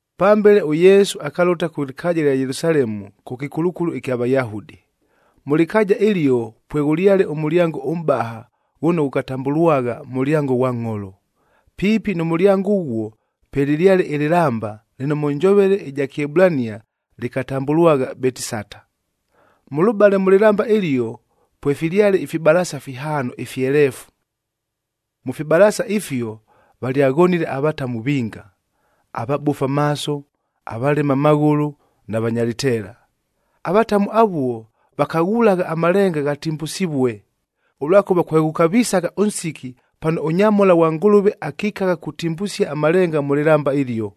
Pambele ʉYesu akalʉta kʉ lɨkaaja ɨlya Yelusalemu kʉ kɨkulukulu ɨkya Vayahudi. Mʉ lɨkaaja ɨlio pweghʉlyale ʉmʉlyango ʉmʼbaha ghʉno ghʉkatambʉlwagha Mʉlyango ghwa Ngʼholo.a Piipi nʉ mʉlyango ʉghuo, pwelɨlyale ɨlɨlamba lɨno mʉ njovele ɨja Kɨebulania lɨkatambʉlwagha Betisata. Mʉlʉbale mʉ lɨlamba ɨlio, pwefilyale ifibalaasa fihaano ifyeleefu. Mʉ fibalaasa ifio valyaghonile avatamu vinga: avabofu amaaso, avalema amaghʉlʉ na vanya lɨteela. Avatamu avuo vakaghulagha amalenga ghatimbusivue, ʉlwakʉva kweghʉkavisagha ʉnsiki pano ʉnyamhola ghwa Ngʉlʉve akikagha kutimbusia amalenga mʉ lɨlamba ɨlio.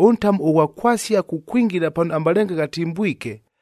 Ʉntamu ʉghwa kwasia kukwingila pano amalenga ghatimbwike,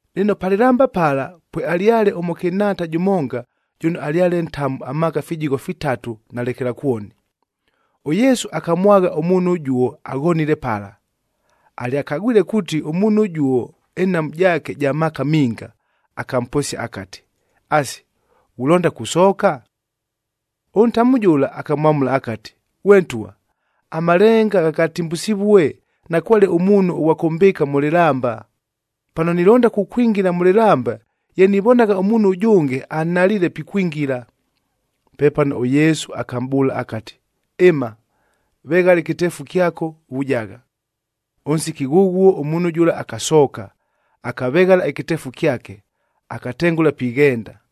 Lɨno pa lɨlamba pala, pwealyale ʉmʉkɨnhaata jʉmonga jʉno alyale ntamu amaaka fijigho fitatu na lekelakwoni. ɄYesu akamwagha ʉmuunhu ʉjuo aghonile pala. Alyakagwile kuuti ʉmuunhu ʉjuo ɨnhamu jaake ja maaka minga, akamposia akati, “Asi, ghulonda kusooka?” Ʉntamu jʉla akamwamʉla akati, “Ghwe ntwa, amalenga ghangatimbusivue, nakwale ʉmuunhu ʉghwa kʉmbɨɨka mʉ lɨlamba. Pano nilonda kukwingila mʉ lɨlamba, ye nivonagha ʉmuunhu ʉjʉnge anhaliile pikwingila.” Pepano ʉYesu akamʼbʉʉla akati, “Ɨma, veghala ɨkɨteefu kyako, vujagha.” Ʉnsiki ghʉghuo ʉmuunhu jʉla akasooka, akaveghala ɨkɨteefu kyake, akatengʉla pighenda.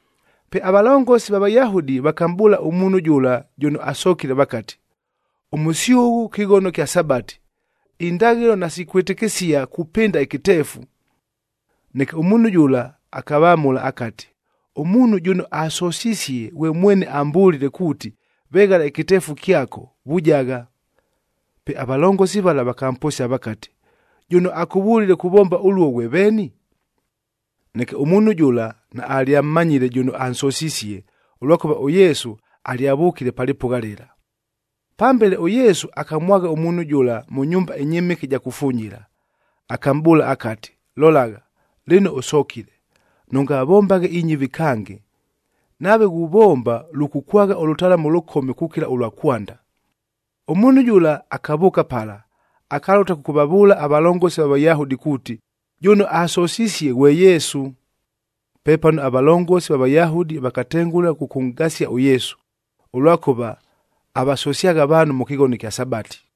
Pe avalongosi va Vayahudi vakamʼbʉʉla ʉmuunhu jʉla jʉno asokile vakati, “Ʉmʉsyʉghʉ kɨghono kya Sabati, indaghɨlo nasikʉkwɨtɨkɨsia kupɨnda ɨkɨteefu.” Neke ʉmuunhu jʉla akavamʉla akati, “Ʉmuunhu jʉno asosisie ghwe mwene ambʉlile kuuti, ‘Veghala ɨkɨteefu kyako, vujagha.’” Pe avalongosi vala vakamposia vakati, “Jʉno akʉvʉlile kuvomba ʉluo ghwe veeni?” Neke ʉmuunhu jʉla naalyammanyile jʉno ansosisie, ʉlwakʉva ʉYesu alyavʉkile pa lɨpʉgha lɨla. Pambele ʉYesu akamwagha ʉmuunhu jʉla mʉ nyumba ɨnyɨmɨke ɨja kufunyila, akamʼbʉʉla akati, “Lolagha, lɨno ʉsokile. Nʉngavombaghe inyɨvi kange, nave ghuvomba lʉkʉkwagha ʉlʉtalamu ʉlʉkome kukila ʉlwa kwanda.” Ʉmuunhu jʉla akavʉʉka pala, akalʉta kʉkʉvavʉʉla avalongosi va Vayahudi kuuti, jʉno ansosisie ghwe Yesu. Pepano avalongosi va Vayahudi vakatengʉla kʉkʉnʼgasia ʉYesu, ʉlwakʉva avasosyagha avaanhu mʉ kɨghono ɨkya Sabati.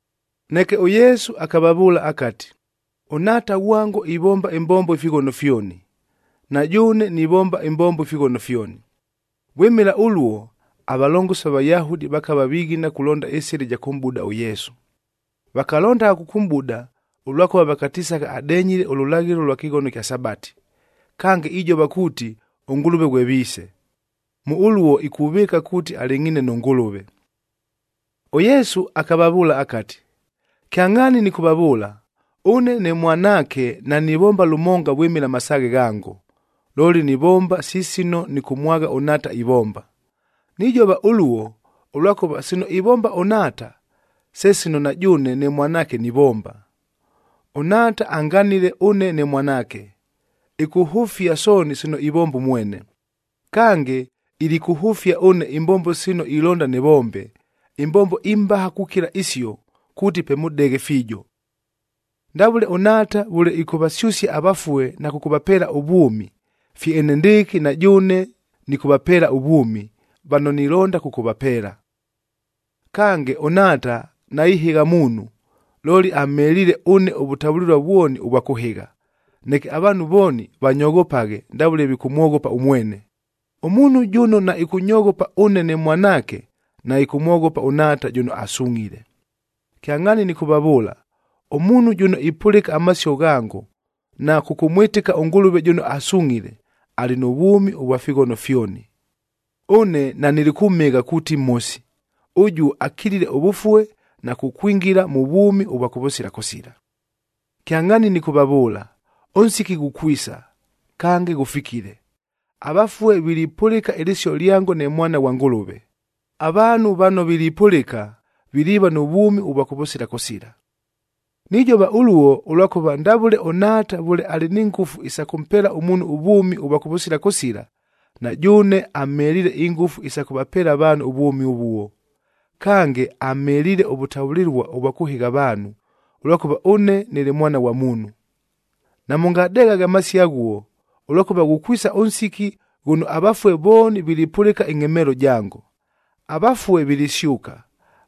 Neke ʉYesu akavavʉʉla akati, “ɄNhaata ghwango ivomba ɨmbombo ifighono fyoni, na jʉʉne nivomba ɨmbombo ifighono fyoni.” Vwɨmɨla ʉluo, avalongosi va Vayahudi vakava vighina kulonda ɨsɨla ɨja kʉmʼbuda ʉYesu. Vakalondagha kʉkʉmʼbuda, ʉlwakʉva vakatisagha adenyile ʉlʉlaghɨlo lwa kɨghono ɨkya Sabati, kange ijova kuuti, ʉNgʉlʉve ghwe Viise. Mʉ ʉluo ikuvɨɨka kuuti alɨngʼhiine nʉ Ngʉlʉve. ɄYesu akavavʉʉla akati, “Kyangʼhaani nɨkʉvavʉʉla, ʉne ne Mwanaake nanivomba lʉmonga vwɨmɨla amasaaghe ghango, looli nivomba si sino nɨkʉmwagha ʉNhaata ivomba. Nijova ʉluo, ʉlwakʉva sino ivomba ʉNhaata, se sino na jʉʉne ne Mwanaake nivomba. ɄNhaata anganile ʉne ne Mwanaake, ɨkʉhʉfia sooni sino ivomba ʉmwene. Kange, ilikʉhʉfia ʉne imbombo sino ilonda nɨvombe, imbombo imbaha kukila isio, kuuti pe mʉdeghe fiijo. Ndavʉle ʉNhaata vʉle ɨkʉvasyʉsia avafue na kʉkʉvapeela ʉvwʉmi, fye enendɨɨkɨ na jʉʉne nɨkʉvapeela ʉvwʉmi, vano nilonda kʉkʉvapeela. Kange, ʉNhaata naihɨgha muunhu, looli amheliile ʉne ʉvʉtavʉlɨlua vwoni ʉvwa kʉhɨgha, neke avaanhu vooni vanyoghopaghe ndavʉle vikʉmwoghopa ʉmwene. Ʉmuunhu jʉno naɨkʉnyoghopa ʉne ne Mwanaake, naɨkʉmwoghopa ʉNhaata jʉno asungʼhile. “Kyangʼhaani nɨkʉvavʉʉla, ʉmuunhu jʉno ipʉlɨka amasio ghango, na kʉkʉmwɨtɨka ʉNgʉlʉve jʉno asungʼhile, alɨ nʉ vwʉmi ʉvwa fighono fyoni. Ʉne nanilikʉmhɨgha kuuti mhosi, ʉjuo akilile ʉvʉfue na kukwingila mʉ vwʉmi ʉvwa kʉvʉsila kʉsila. Kyangʼhaani nɨkʉvavʉʉla, ʉnsiki ghukwisa, kange ghʉfikile, avafue vilipʉlɨka ɨlɨsio lyango ne Mwana ghwa Ngʉlʉve. Avaanhu vano vilipʉlɨka, viliiva nʉ vwʉmi ʉvwa kʉvʉsila kʉsila. Nijova ʉluo, ʉlwakʉva ndavʉle ʉNhaata vʉle alɨ ni ngʉfu isa kʉmpeela ʉmuunhu ʉvwʉmi ʉvwa kʉvʉsila kʉsila, na jʉʉne amheliile ingʉfu isa kʉvapeela avaanhu ʉvwʉmi ʉvuo. Kange, amheliile ʉvʉtavʉlɨlua ʉvwa kʉhɨgha avaanhu, ʉlwakʉva ʉne nɨlɨ Mwana ghwa Muunhu. Namʉngadeghaghe amasio aghuo, ʉlwakʉva ghukwisa ʉnsiki ghʉno avafue vooni vilipʉlɨka ɨngʼhemeelo jango. Avafue vilisyʉka,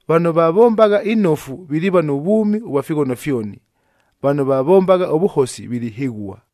vano vavombagha inofu viliiva nʉ vwʉmi ʉvwa fighono fyoni, vano vavombagha ʉvʉhosi vilihɨghua.”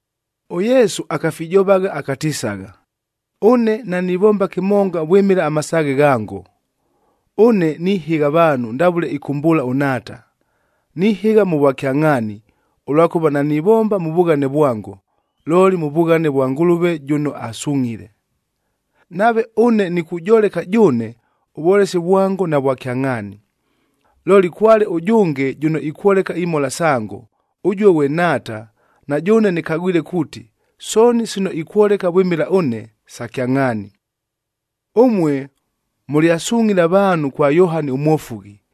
ɄYesu akafijovagha akatisagha, “Ʉne nanivomba kɨmonga vwɨmɨla amasaaghe ghango, ʉne nihɨgha avaanhu ndavʉle ɨkʉmbʉʉla ʉNhaata. Nihɨgha mʉ vwakyangʼhaani, ʉlwakʉva nanivomba mʉ vughane vwango, looli mʉ vughane vwa Ngʉlʉve jʉno asungʼhile. Nave ʉne nikujoleka jʉʉne, ʉvwolesi vwango navwa kyangʼhaani. Looli kwale ʉjʉnge jʉno ikwoleka imhola sango, ʉjuo ghwe Nhaata, na jʉʉne nɨkagwile kuuti, sooni sino ikwoleka vwɨmɨla ʉne, sa kyangʼhaani. Ʉmue mʉlyasungʼhile avaanhu kwa Yohani ʉMwofughi,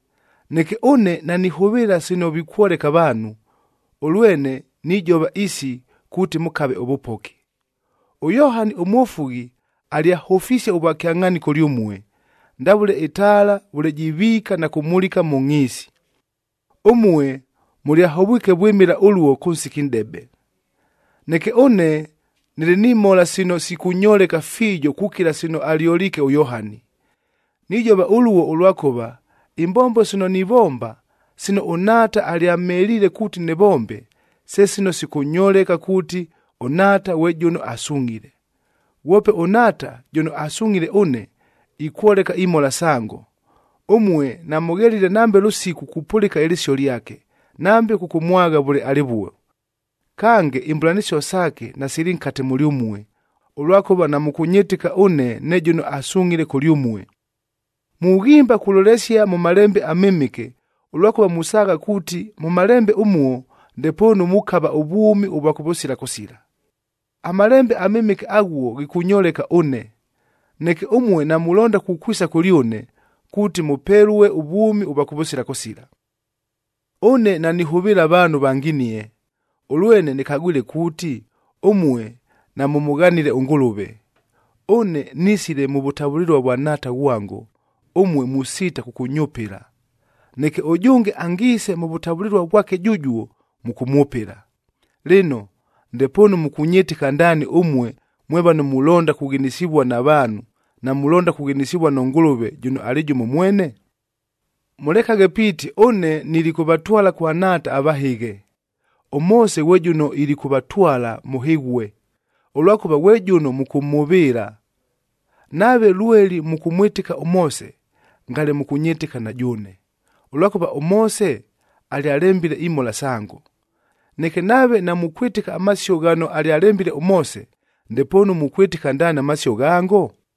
Neke ʉne nanihʉvɨɨla sino vikwoleka avaanhu, ʉlwene nijova isi kuuti mʉkave ʉvʉpoki. ɄYohani ʉMwofughi alyahʉfisie ʉvwakyangʼhaani kʉlyʉmue, ndavʉle ɨtaala vʉle jiviika na kumulika mʉ ngʼhiisi. Ʉmue mʉlyahovwike vwɨmɨla ʉluo kʉ nsiki nʼdebe. “Neke ʉne nɨlɨ ni mhola sino sikʉnyoleka fiijo kukila sino alyoliike ʉYohani. Nijova ʉluo, ʉlwakʉva imbombo sino nivomba, sino ʉNhaata alyamheliile kuuti nɨvombe, se sino sikʉnyoleka kuuti, ʉNhaata ghwe jʉno asungʼhile. Ghwope ʉNhaata jʉno asungʼhile ʉne, ikwoleka imhola sango. Ʉmue namʉghelile nambe lʉsiku kupʉlɨka ɨlɨsio lyake, nambe kʉkʉmwagha vʉle alɨvuo. Kange, imbʉlanɨsio saake nasili nkate mʉlyʉmue, ʉlwakʉva namʉkʉnyɨtɨka ʉne ne jʉno asungʼhile kʉlyʉmue. Mughimba kulolesia mʉ Malembe aMɨmɨke, ʉlwakʉva musaagha kuuti mʉ Malembe ʉmuo ndepoonu mukava ʉvwʉmi ʉvwa kʉvʉsila kʉsila. AMalembe aMɨmɨke aghuo ghikʉnyoleka ʉne. Neke ʉmue namulonda kukwisa kʉlyʉne, kuuti mʉpelue ʉvwʉmi ʉvwa kʉvʉsila kʉsila. “Ʉne nanihʉvɨɨla avaanhu vanginie. Ʉlwene nɨkagwile kuuti ʉmue namʉmʉghanile ʉNgʉlʉve. Ʉne nisile mʉ vʉtavʉlɨlua vwa Nhaata ghwango, ʉmue musiita kʉkʉnyʉpɨla. Neke ʉjʉnge angiise mʉ vʉtavʉlɨlua vwake jʉjuo, mʉkʉmwʉpɨla. Lɨno, ndepoonu mʉkʉnyɨtɨka ndaani ʉmue mwe vano mulonda kughinisivua na vaanhu, namulonda kughinisivua nʉ Ngʉlʉve jʉno alɨ jʉmo mwene? “Mʉlekaghe piiti ʉne nilikʉvatwala kwa Nhaata avahɨghe. ɄMoose ghwe jʉno ilikʉvatwala mʉhɨghue, ʉlwakʉva ghwe jʉno mʉkʉmhʉvɨɨla. Nave lweli mʉkʉmwɨtɨka ʉMoose, ngale mʉkʉnyɨtɨka na jʉʉne, ʉlwakʉva ʉMoose alyalembile imhola sango. Neke nave namukwɨtɨka amasio ghano alyalembile ʉMoose, ndepoonu mukwɨtɨka ndaani amasio ghango?”